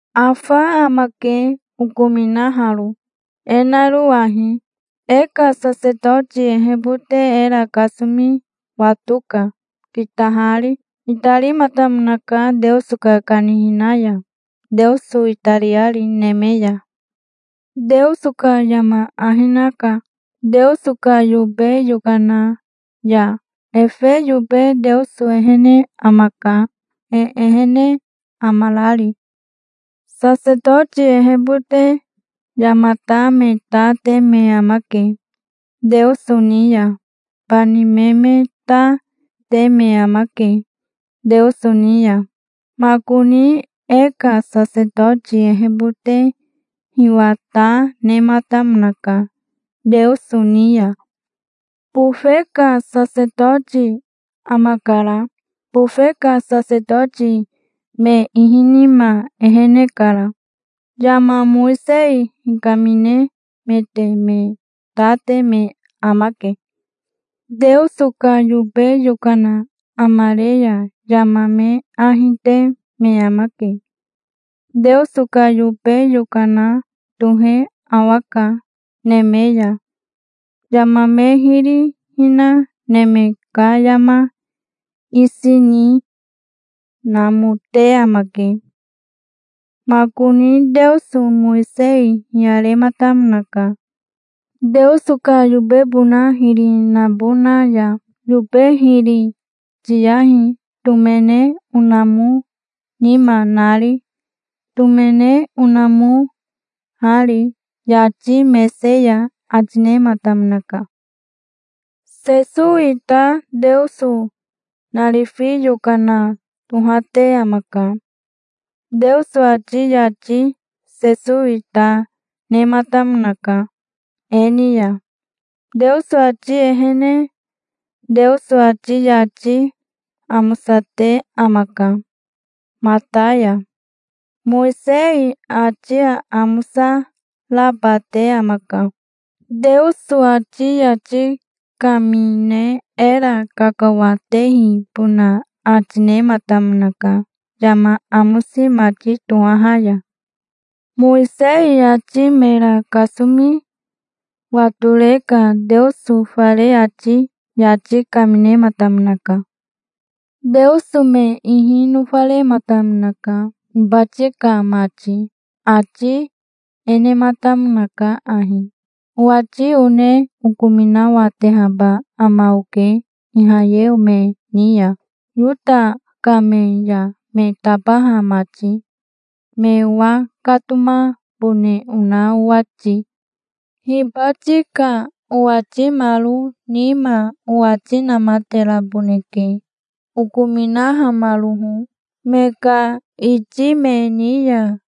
Afa amake, okominaharo, e naro ahi: e ka sasetoti ehebote era kasomi watoka, kitahari. Itarimatamonaka Teoso ka kanihina ya, Teoso itariari neme ya. Teoso ka yama ahi naka, Teoso ka yobe yokana ya. Efe yobe Teoso ehene amaka, e ehene amarari. Sasetoti ehebote yamata me ta te me amake Teoso ni ya. Bani me me ta, te me amake, Teoso ni ya. Makoni e ka sasetoti ehebote hiwa ta nematamonaka Teoso ni ya. Bofe ka sasetoti amakara. Bofe ka sasetoti me ihi nima ehene kara. Yama Mowisei hikaminemete me ta te me amake. Teoso ka yobe yokana amare ya yama me ahi te me amake. Teoso ka yobe yokana tohe awaka neme ya. Yama me hiri hina neme ka yama isi ni namote amake. Makoni Teoso Mowisei hiyarematamonaka, Teoso ka yobebona hiri nabona ya. "Yobe hiri tiyahi, tomene onamo nima nari, tomene onamoari yati mese ya", ati nematamonaka. Sesowi ta Teoso narifi yokana tohate amaka. Teoso ati yati Sesowi ta nematamonaka e ni ya, Teoso ati ehene. Teoso ati yati amosate amaka mata ya. Mowisei ati aamosa raba te amaka. Teoso ati yati kamine era kakawatehibona ati nematamonaka yama amosi mati tohaha ya. Mowisei ati mera kasomi watore ka Teoso fare ati yati kaminematamonaka. Teoso me ihi nofarematamonaka, hibati ka mati. Ati e nematamonaka ahi: "Owati one okominawatehaba ama oke Ihayeo me ni ya, Yota ka me ya me tabaha mati, me owakatomabone ona owati. Hibati ka owatimaro nima owati namateraboneke, okominahamaroho me ka iti me ni ya.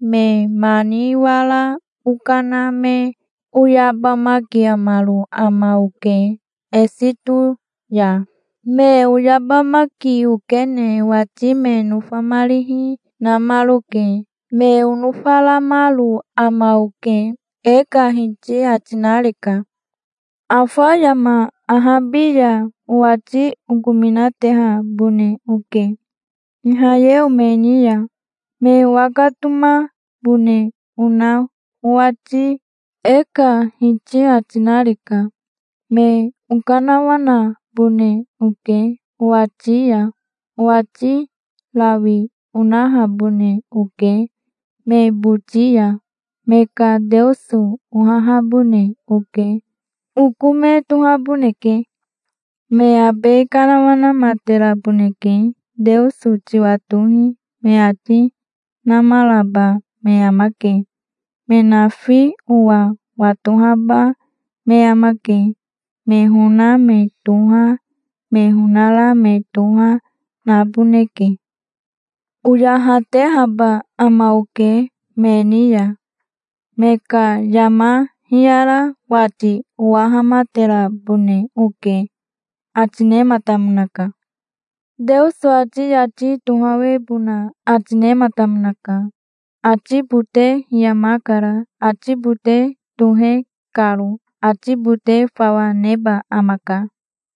Me mani wara okana me oyabamakiamaro ama oke Esito ya. Me oyabamaki okene owati me nofamarihi namaroke. Me onofaramaro ama oke, e ka Hiti ati nareka. Afa yama ahabi ya, owati okominatehabone oke Ihayeo me ni ya, me owakatomabone ona owati, e ka Hiti ati nareka. Me okanawanabone oke owati ya. Owati rawi onahabone oke me boti ya. Me ka Teoso ohahabone oke. Oko me tohaboneke. Me abe kanawanamateraboneke. 'Teoso tiwatohi', me ati namaraba me amake. Me nafi owa watohaba me amake. Me hona me toha, me honara me toha, naboneke. Oyahatehaba ama oke me ni ya. Me ka yama hiyara wati owahamaterabone oke", ati nematamonaka. Teoso ati yati tohawebona ati nematamonaka. Ati bote hiyamakara, ati bote tohe karo. Ati bote fawa neba amaka.